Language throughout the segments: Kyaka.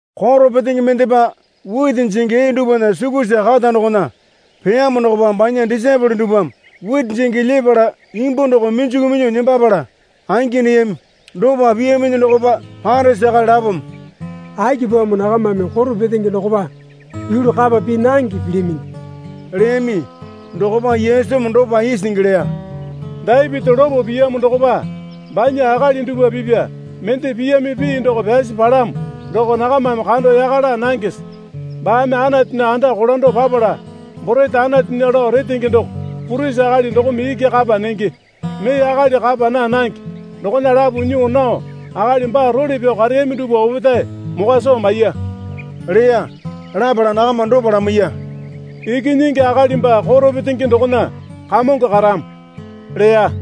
Koro petenge mendepa witi jingi ee dupwana sukusa kata dokona peyamo dokopa banya disaepole dupwame witi jingi lyepala imbu doko minjuku minyuo nembapala angi neyami. Dopa piyaminyi dokopa Parisi akali lapome, Akipamo nakamame koro petenge dokopa yulu kapa pii nange pilyaminyi? leyami. Dokopa Yesumi dopa isingi leya. Dapiti lopo piyamo dokopa banya akali dupwa pipya mende piyami pii doko pyasi palamo doko nakamame kando yaka laa nangese? Baame Anatunya anda kolando papala borete Anatunya lao retenge doko purisi akali dokome iki kapa nenge, mee akali kapa naa nange, dokona lapo nyuo nao akali baa role pyao kareyami dupwa opetae mokwa soo maiya leya. Lapala nakama dopa lamaiya. Ikinyingi Akali baa koro petenge dokona Kamongo karamo, leya.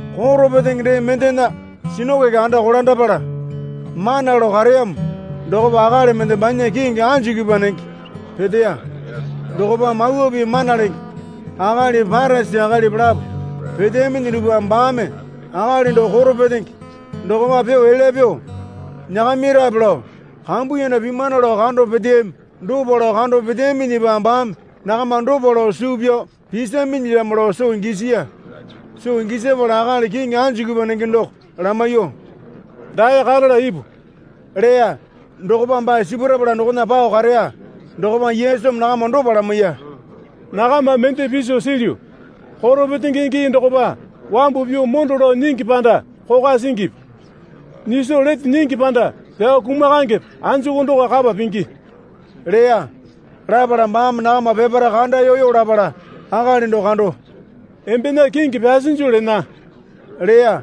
Koro petenge dee mendena sinakoke anda kolandapala mana lao kareyamo dokopa akali mende banya kingi anjikipwa nenge peteya. Dokopa Mawa Pii mana lenge akalipi Parisi akalipi lapo peteyaminyi dupwame baame akali doko koro petenge dokopa pyuo elya pyuo nyakamirape lao kambuyanda pimana lao kando peteyami. Dopa lao kando peteyaminyipa baame nakama dopa lao suu pyao pisaminyilyamo lao soo gisiya. Soo gisapala akali kingi anjikipwa nenge doko lamaiyuo, Dae karala ipu leya. Dokopa baa sipurapala dokona pao kareya. Dokopa Yesumi nakama dopa lamaiya. Nakama mende piso silyu. Koro petenge gii dokopa wambu pyuo mondo lao nyingi panda kokwa singipi? Nyiso lete nyingi panda pyao kumakangepe, anjuku doko kapa pingi? leya. Lapala baame nakama peparae kandayoyo lapala akali doko kando, Embena kingi pyasinju lena, leya.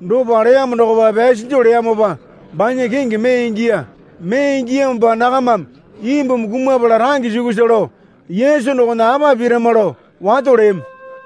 Dopa leyamo dokopa pyasinju leyamopa banya kingi mee ingiya. Mee ingiyamopa nakamame imbumi kumapala range sukusa lao Yesu dokona apa pirama lao wato leyami.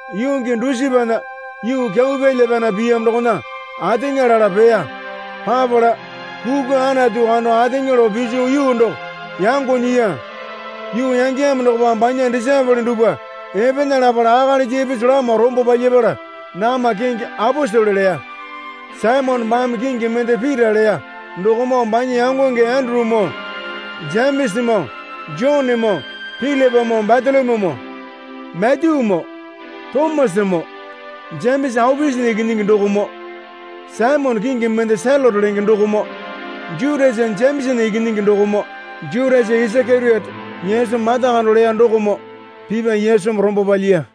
Yuu gii dusipana yuu kyau pyalya pyana piyamo dokona ateŋa lala peya. Papala kukwa Anatu kando ateŋa lao piso yuu doko yango nyiya. Yuu yangeyamo dokopa banya disaepole dupwa epena lalapa akalisa ipisu lama rombo palyapala nakama kingi aposele leya. Saimone baame kingi mende Pita leya dokomoo banya yangonge Endurumoo Jemesamoo Jonemoo Pilipamoo Batolomyumoo Matyumoo Tomasamoo Jemesa Aopiasana ikinyingi dokomoo Saimone kingi mende Selote lenge dokomoo Jutasa Jemesana ikinyingi dokomoo Jutasa Isakeriote Yesu mata kando leya dokomoo pipa Yesumi rombo palyiya.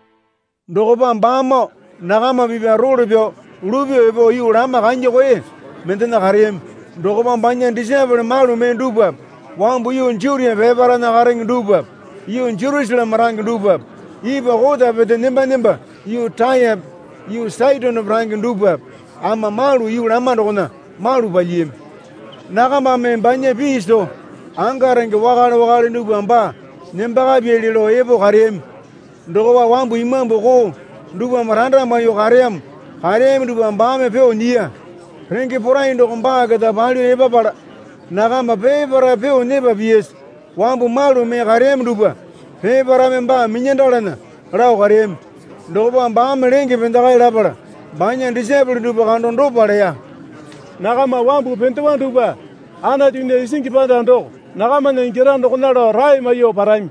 Dokopa baamoo nakama pipya role pyao lupyuo epo yuu lama kanya koe mendena kareyami. Dokopa banya disaepole malu mee dupwape wambu yuu Jutia peparaena karenge dupwape yuu Jerusaleme range dupwape ipwa kota pete nemba nemba yuu Tayape yuu Saitonepe range dupwape ama malu yuu lama dokona malu palyiyami. Nakamame banya pii soo anga renge wakale wakale dupwa baa nembakapyali lao epo kareyami. Dokopa wambu imambu koo dupwame randa maiyuo kareyamo kareyami dupwa baame pyuo nyiya. Renge porai doko baa keta palyuo epapala nakama peparae pyuo nyepa piyasa wambu malu mee kareyami dupwa peparaeme baa minyandalana lao kareyami. Dokopa baame lenge pendekae lapala banya disaepole dupwa kando dopa leya. Nakama wambu pendewa dupwa Anatunya isingi panda doko nakamana ingyara dokona lao rae maiyuo parami.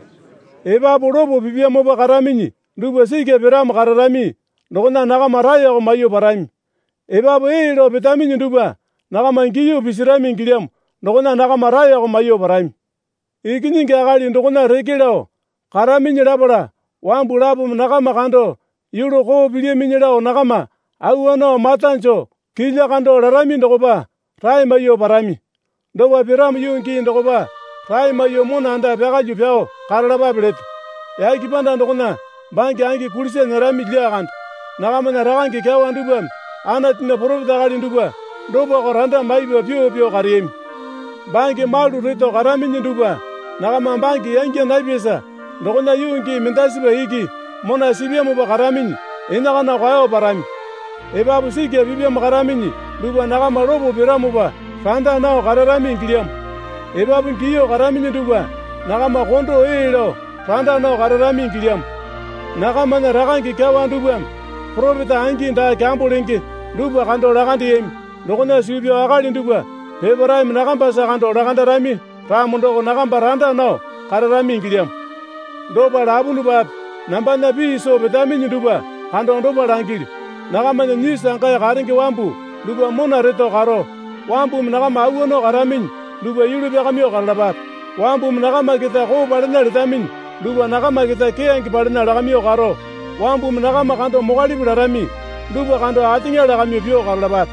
Epapu lopo pipyamopa karaminyi dupwa sikya piramo kararami dokona nakama raeko maiyuo parami. Epapu ee lao petaminyi dupwa nakama giyuo pisirami ingilyamo dokona nakama raeko maiyuo parami. Ikinyingi Akali dokona reke lao karaminyi lapala wambu lapome nakama kando yulu koo pilyaminyi lao nakama awa nao mata joo kilya kando larami dokopa rae maiyuo parami. Dopa piramo yuu gii dokopa rae maiyuo mona anda pyakalyuo pyao karalapape leto. Yake panda dokona bange angi kulisa nyerami lyakande. Nakamana rakange kyawa dupwame Anatunya poropeta akali dupwa dopako randa maipa pyuo pyuo kareyami. Bange malu reto karaminyi dupwa nakama bange yangya napyasa dokona yuu gii mendasipa iki mona sipyamopa karaminyi enakana kwao parami. Epapu sikya pipyamo karaminyi dupwa nakama lopo piramopa randa nao kararami ingilyamo. Epapu giyuo karaminyi dupwa nakama kondo ee lao randa nao kararami ingilyamo. Nakamana rakange kyawa dupwame poropeta angi daa kyambo lenge dupwa kando lakandeyami. Dokona suu pyao akali dupwa peparaeme nakambasa kando lakandarami ramo doko nakamba randa nao kararami ingilyamo. Dopa lapunupape nambana pii soo petaminyi dupwa kando dopa langilyu. Nakamana nyisu angae karenge wambu dupwa mona reto karo, wambumi nakama awa nao karaminyi dupwa yulu pyakamyuo karalapape. Wambumi nakama keta koo palena letaminyi dupwa nakama keta keyange palena lakamyuo karo, wambumi nakama kando mokwalipi larami dupwa kando ateŋa lakamyuo pyuo karalapape.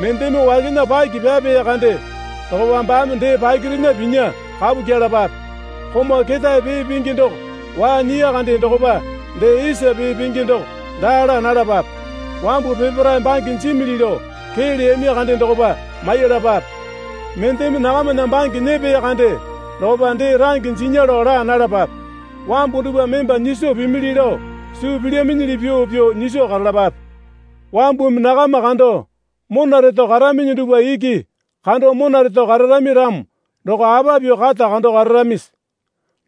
Mendeme wakena paki pyapeya kande dokopa baame dee pakirena pinya kapu kyelapape. Komau ketae pee pingi doko waa nyiya kande dokopa dee isa pee pingi doko daa laa nalapape. Wambu peparae bange jimili lao kee leyami kande dokopa maiyalapape. Mendeme nakamana bange nyepeya kande dokope dee range jinya lao laa nalapape. Wambu dupwame emba nyiso pimili lao suu pilyaminyili pyuo pyuo nyiso karalapape. Wambumi nakama kando mona reto karaminyi dupwa iki kando mona reto kararami ramo doko apa pyuo kata kando kararamisi?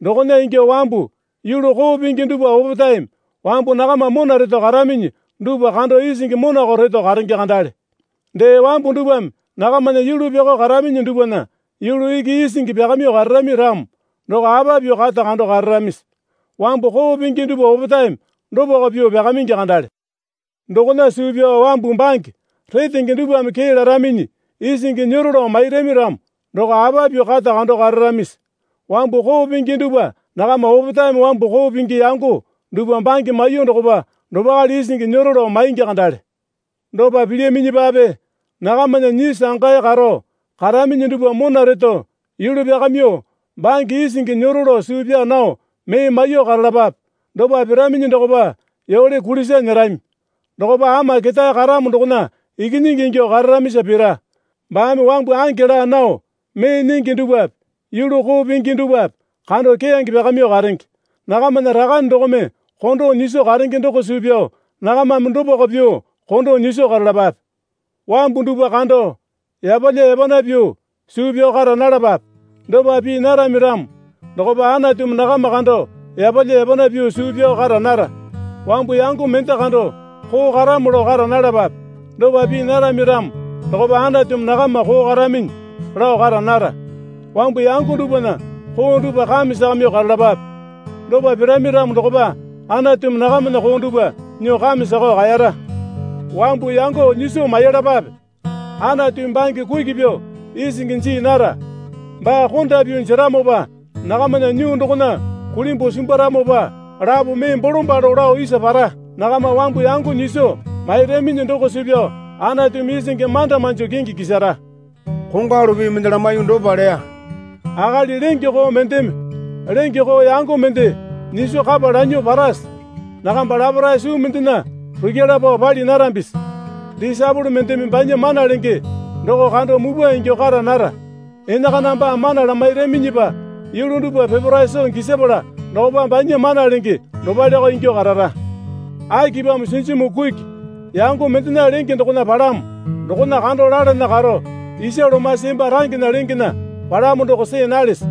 Dokona ingyuo wambu yulu koo pingi dupwa opetaeme wambu nakama mona reto karaminyi dupwa kando isingi monako reto karenge kandale. Dee, wambu dupwame nakamana yulu pyakao karaminyi dupwana yulu iki isingi pyakamyuo kararami ramo doko apa pyuo kata kando kararamisi? Wambu koo pingi dupwa opetaeme dopako pyuo pyakamingi kandale. Dokona suu pyao wambu bange retenge dupwame kee laraminyi, isingi nyero lao mairami ramo, doko apa pyuo kata kando kararamisi? Wambu koo pingi dupwa nakama opetaeme wambu koo pingi yango dupwa bange maiyuo dokopa dopakale isingi nyero lao maingi kandale. Dopa pilyaminyipape nakamana nyisu angae karo karaminyi dupwa mona reto yulu pyakamyuo bange isingi nyero lao suu pyaa nao mee maiyuo karalapape. Dopa piraminyi dokopa yole kulisa nyerami. Dokopa Ama Ketae Karamo dokona ikinyingi ingyuo kararamisa pita. Baame wambu ange laa nao mee nyingi dupwape yulu koo pingi dupwape kando keyange pyakamyuo karenge. Nakamana Rakane dokome kondo nyiso karenge doko suu pyao nakamame dopako pyuo kondo nyiso karalapape. Wambu dupwa kando yapalya yapana pyuo suu pyao kara nalapape. Dopa pii narami ramo dokopa Anatumi nakama kando yapalya yapana pyuo suu pyao kara nara. Wambu yango mende kando koo karamo lao kara nalapape. Dopa pii narami ramo dokopa Anatumi nakama koo karaminyi lao kara nara. Wambu yango dupwana koo dupwa kame sakamyuo karalapape. Dopa pirami ramo dokopa Anatumi nakamana koo dupwa nyuo kame sakao kaeyara. Wambu yango nyiso maiyalapape. Anatumi bange kuki pyuo isingi jii nara. Baa konda pyuo jeramopa nakamana nyuu dokona kulimbuo simbwaramopa lapo mee bolombalo lao isa para. Nakama wambu yango nyiso mairaminyi doko suu pyao Anatumi isingi manda manjo kingi kisara. Kongwalu pii mende lamaiyuo dopa leya. Akali lenge koo mendeme lenge koo yango mende nyiso kapa lanyuo parase? Nakamba laparae suu mendena rukyala pao pali narambisi? Disaepole mendeme banya mana lenge doko kando mupwa ingyuo kara nara. Enakana baa mana lamairaminyipa yulu dupwa peparae soo gisapala dokopa banya mana lenge dopaleko ingyuo karara. Akipamo sinjimu kuki yango mendena lenge dokona palamo dokona kando lalana karo isa lomasi emba rangena lengena palamo doko see nalese?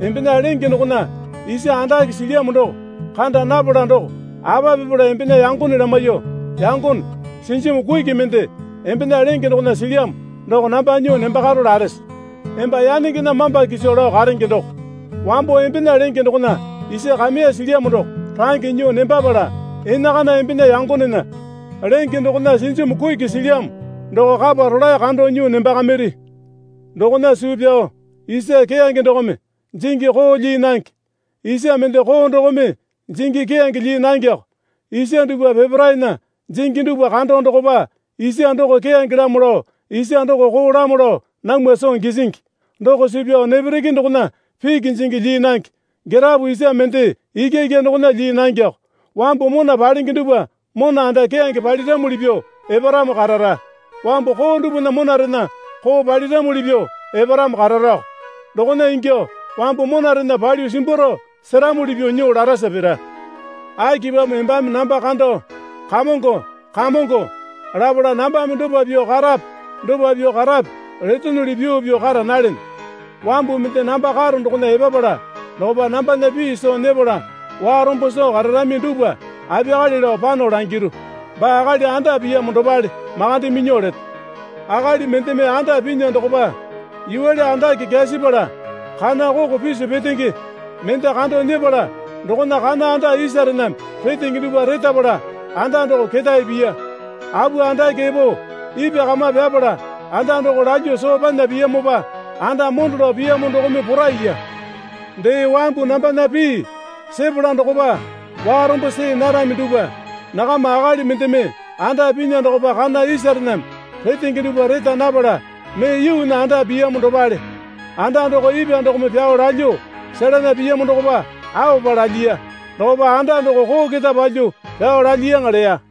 Embena lenge dokona isa andake silyamo doko kanda napala doko apa pipala embena yangone lamaiyuo, Yangone, sinjimu kuki mende embena lenge dokona silyamo doko namba nyuo nembakaro larese? Emba yanengena mamba kiso lao karenge doko, wambo embena lenge dokona isa kameya silyamo doko range nyuo nembapala enakana embena yangonena lenge dokona sinjimu kuki silyamo doko kapa rolae kando nyuo nembakamiri. Dokona suu pyao isa keyange dokome jingi koo lyii nange. Isa mende koo dokome jingi keyange lyii nangeko. Isa dupwa peparaena jingi dupwa kando dokopa isa doko keyangelamo lao isa doko koolamo lao namwa soo gisingi. Doko suu pyao nepereke dokona piki jingi lyii nange. Girapo isa mende ikyaikya dokona lyii nangeko. Wambu mona palenge dupwa mona anda keyange paliramuli pyuo eparamo karara. Wambu koo dupwana monarena koo paliramuli pyuo eparamo kararako. Dokona ingyuo wambu monarena palyuo simbwaro seramuli pyuo nyuo larasa pira. Akipamo embame namba kando, Kamongo, Kamongo, lapala nambame dopa pyuo karape dopa pyuo karape letonuli pyuo pyuo kara nalene? Wambu mende namba karo dokona epapala dokopa nambana pii soo nyepala warombo soo kararami dupwa apiyakale lao pano langiru. Baa akali anda piyamo dopale makande minyuo leto. Akali mendeme anda pinya dokopa yuwale andake kyasipala kana koko pisu petenge mende kando nyepala dokona kana anda isarename retenge dupwa retapala anda doko ketae piya. Apu andake epo ipwa kama pyapala anda doko lalyuo soo panya piyamopa anda mondo lao piyamo dokome poraiya. Dee wambu nambana pii sepala dokopa warombo see narami dupwa nakama akali mendeme anda pinya dokopa kana isarename retenge dupwa reta napala mee yuunya anda piyamo dopale. Anda doko ipwa dokome pyao lalyuo selana piyamo dokopa aopa lalyiya. Dokopa anda doko koo keta palyuo pyao lalyiyaŋa leya.